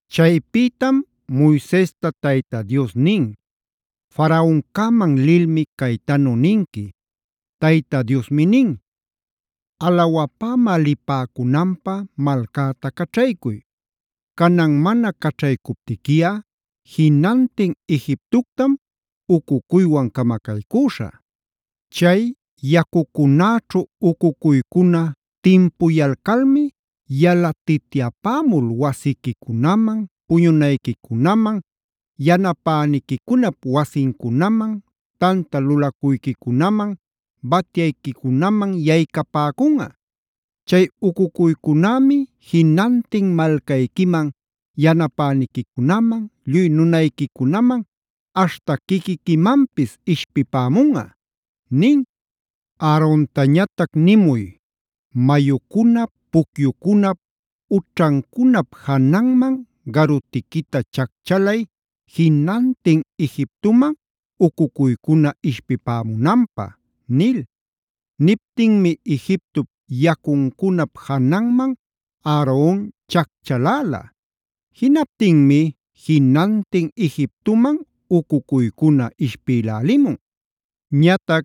Chaypïtam Moisesta Tayta Dios nin: “Faraoncäman lilmi caytanu ninqui: Tayta Diosmi nin: ‘Alawapämä lipäcunanpä malcäta caćhaycuy. Canan mana caćhaycuptiquiꞌa jinantin Egiptoctam ucucuywan camacaycüśhä.a Chay yacucunäćhu ucucuycuna timpuyalcalmi yalatityapämul wasiquicunaman puñunayquicunaman, yanapäniquicunap wasincunaman, tanta lulacuyquicunaman, batyayquicunaman yaycapäcunꞌa. Chay ucucuycunämi jinantin malcayquiman, yanapäniquicunaman, lluy nunayquicunaman aśhta quiquiquimanpis ishpipämunꞌa’ nin. “Aarontañatac nimuy: ‘Mayucunap, pucyucunap, ućhancunap jananman garutiquita chacchalay jinantin Egiptoman ucucuycuna ishpipämunanpä’” nil. Niptinmi Egiptop yacuncunap jananman Aaron chacchaläla. Jinaptinmi jinantin Egiptoman ucucuycuna ishpïlälimun. Ñatac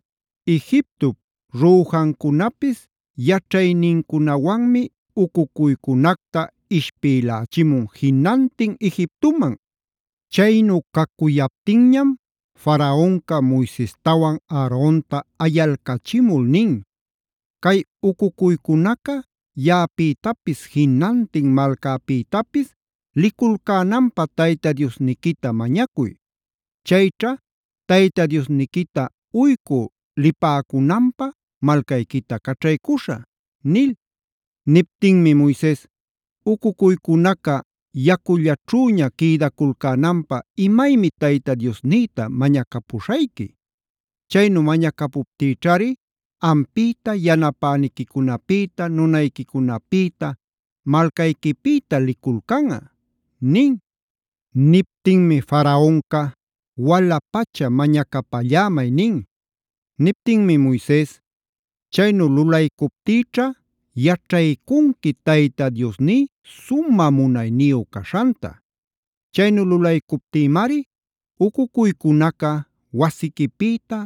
Egiptop rüjancunapis yaćhaynincunawanmi ucucuycunacta ishpïlächimun jinantin Egiptoman. Chaynu cacuyaptinñam Faraonca Moisestawan Aaronta ayalcachimul nin: “Cay ucucuycunaca yaꞌapïtapis jinantin malcäpïtapis liculcänanpä Tayta Diosniquita mañacuy. Chayćha Tayta Diosniquita uycü lipäcunanpä malcayquita caćhaycuśhä” nil. Niptinmi Moises: “¿Ucucuycunaca yacullachüña quïdaculcänanpä imaymi Tayta Diosnïta mañacapuśhayqui? Chaynu mañacuptïćhari ampïta, yanapäniquicunapïta, nunayquicunapïta, malcayquipïta liculcanꞌa” nin. Niptinmi Faraonca: “Wala-pacha mañacapallämay” nin. Niptinmi Moises: “Chaynu lulaycuptïćha yaćhaycunqui Tayta Diosní sumä munayniyu caśhanta. Chaynu lulaycuptïmari ucucuycunaca wasiquipïta,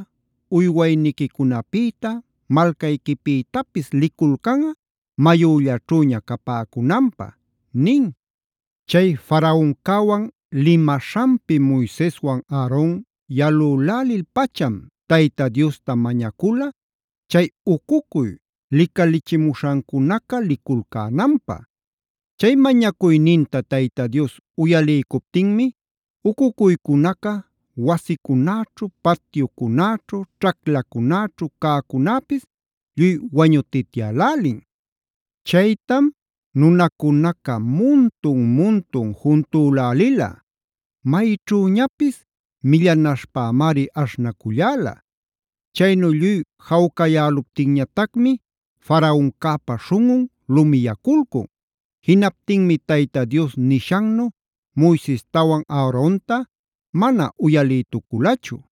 uywayniquicunapïta, malcayquipïtapis liculcanꞌa mayüllaćhüña capäcunanpä” nin. Chay Faraoncäwan limaśhanpi Moiseswan Aaron yalülälil-pacham Tayta Diosta mañacula chay ucucuy licalichimuśhancunaca liculcänanpä. Chay mañacuyninta Tayta Dios uyaliycuptinmi ucucuycunaca wasicunäćhu, patyucunäćhu, ćhaclacunäćhu cäcunäpis lluy wañutityälälin. Chaytam nunacunaca muntun-muntun juntülälila; mayćhüñapis millanaśhpämari aśhnaculläla. Chaynu lluy jawcayäluptinñatacmi Faraoncäpa śhunꞌun lumiyaculcun. Jinaptinmi Tayta Dios nishannu Moisestawan Aaronta mana uyalïtuculachu.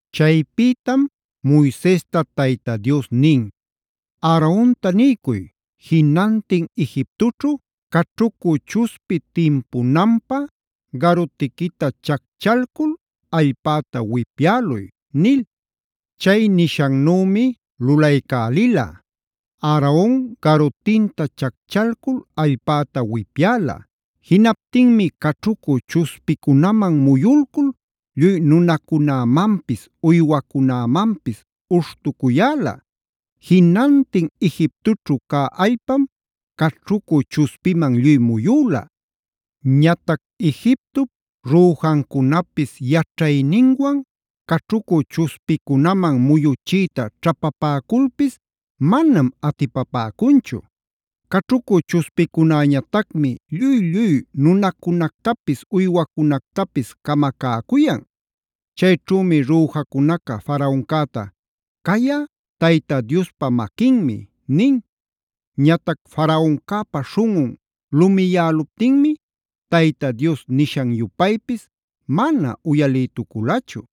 Chaypïtam Moisesta Tayta Dios nin: “Aaronta niycuy: Jinantin Egiptoćhu caćhucü chuspi timpunanpä garutiquita chacchalcul allpäta wipyäluy” nil. Chay nishannümi lulaycälila; Aaron garutinta chacchalcul allpäta wipyäla. Jinaptinmi caćhucü chuspicunaman muyulcul lluy nunacunämanpis, uywacunämanpis ushtucuyäla. Jinantin Egiptoćhu cä allpam caćhucü chuspiman lluy muyüla. Ñatac Egiptop rüjancunapis yaćhayninwan caćhucü chuspicunaman muyuchiyta ćhapapäculpis manam atipapäcunchu. Caćhucü chuspicunäñatacmi lluy-lluy nunacunactapis, uywacunactapis camacäcuyan. Chayćhümi rüjacunaca Faraoncäta: “Cayꞌa Tayta Diospa maquinmi” nin. Ñatac Faraoncäpa śhunꞌun lumiyäluptinmi Tayta Dios nishan-yupaypis mana uyalïtuculachu.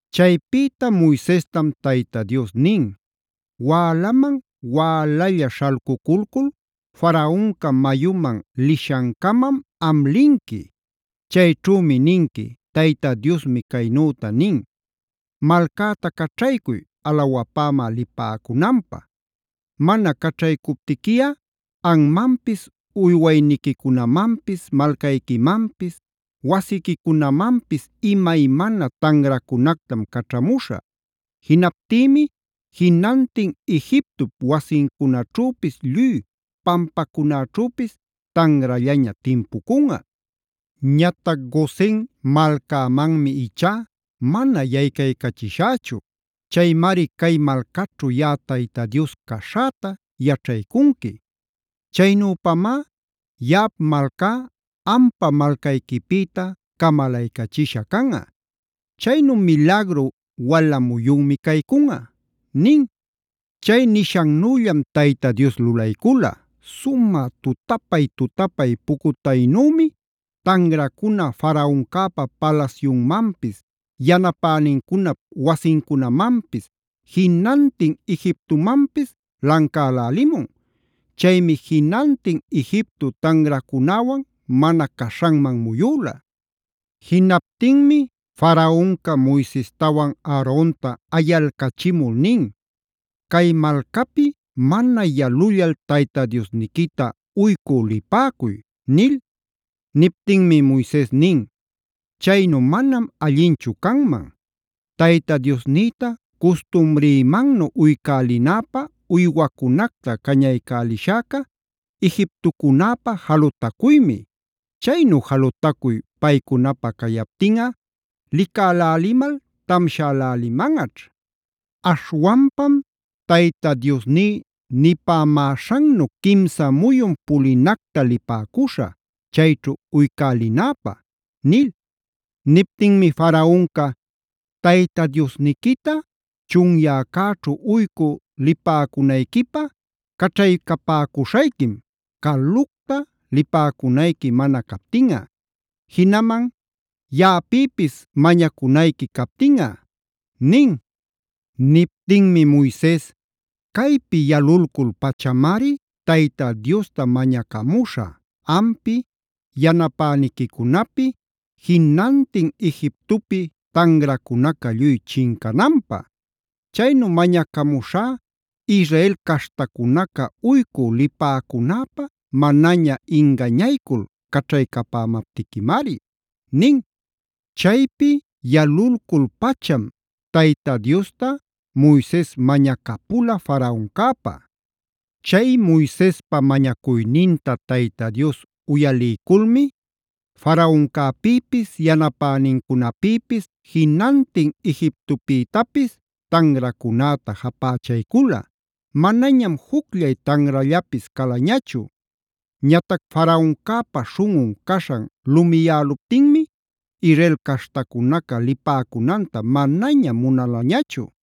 Chaypïta Moisestam Tayta Dios nin: “Wälaman wälalla śhalcuculcul Faraonca mayuman lishancämam am linqui. Chayćhümi ninqui: Tayta Diosmi caynüta nin: ‘Malcäta caćhaycuy alawapämä lipäcunanpä. Mana caćhaycuptiquiꞌa anmanpis, uywayniquicunamanpis, malcayquimanpis, wasiquicunamanpis imaymana tanracunactam caćhamuśhä. Jinaptïmi jinantin Egiptop wasincunaćhüpis lluy pampacunäćhüpis tanrallaña timpucunꞌa. Ñatac Gosen malcämanmi ichá mana yaycaycachishächu. Chaymari cay malcaćhu yaꞌa Tayta Dios caśhäta yaćhaycunqui. Chaynüpamá yaꞌap malcá ampa malcayquipïta camalaycachisha canꞌa. Chaynu milagru wala muyunmi caycunꞌa’” nin. Chay nishannüllam Tayta Dios lulaycula. Sumä tutapay-tutapay pucutaynümi tanracuna Faraoncäpa palasyunmanpis, yanapänincunap wasincunamanpis, jinantin Egiptomanpis lancälälimun. Chaymi jinantin Egipto tanracunäwan mana caśhanman muyüla. Jinaptinmi Faraonca Moisestawan Aaronta ayalcachimul nin: “Cay malcapi mana yalullal Tayta Diosniquita uycü lipäcuy” nil. Niptinmi Moises nin: “Chaynu manam allinchu canman. Tayta Diosnïta custumrïmannu uycälinäpä uywacunacta cañaycälishäca Egiptocunäpä jalutacuymi. Chaynu jalutacuy paycunapä cayaptinꞌa licälälimal tamshälälimanꞌaćh. Aśhwanpam Tayta Diosní nipämäśhannu quimsa muyun pulinacta lipäcuśhä chayćhu uycälinäpä” nil. Niptinmi Faraonca: “Tayta Diosniquita chunyäcäćhu uycü lipäcunayquipä caćhaycapäcuśhayquim, calucta lipäcunayqui mana captinꞌa. Jinaman yaꞌapïpis mañacunayqui captinꞌa” nin. Niptinmi Moises: “Caypi yalulcul-pachamari Tayta Diosta mañacamuśhä ampi, yanapäniquicunapi, jinantin Egiptopi tanracunaca lluy chincananpä. Chaynu mañacamuśhä Israel caśhtacunaca uycü lipäcunäpä manaña ingañaycul caćhaycapämaptiquimari” nin. Chaypi yalulcul-pacham Tayta Diosta Moises mañacapula Faraoncäpä. Chay Moisespa mañacuyninta Tayta Dios uyaliyculmi Faraoncäpïpis, yanapänincunapïpis, jinantin Egiptopïtapis tanracunäta japächaycula. Manañam jucllay tanrallapis calañachu. Ñatac Faraoncäpa śhunꞌun caśhan lumiyäluptinmi Israel caśhtacunaca lipäcunanta manaña munalañachu.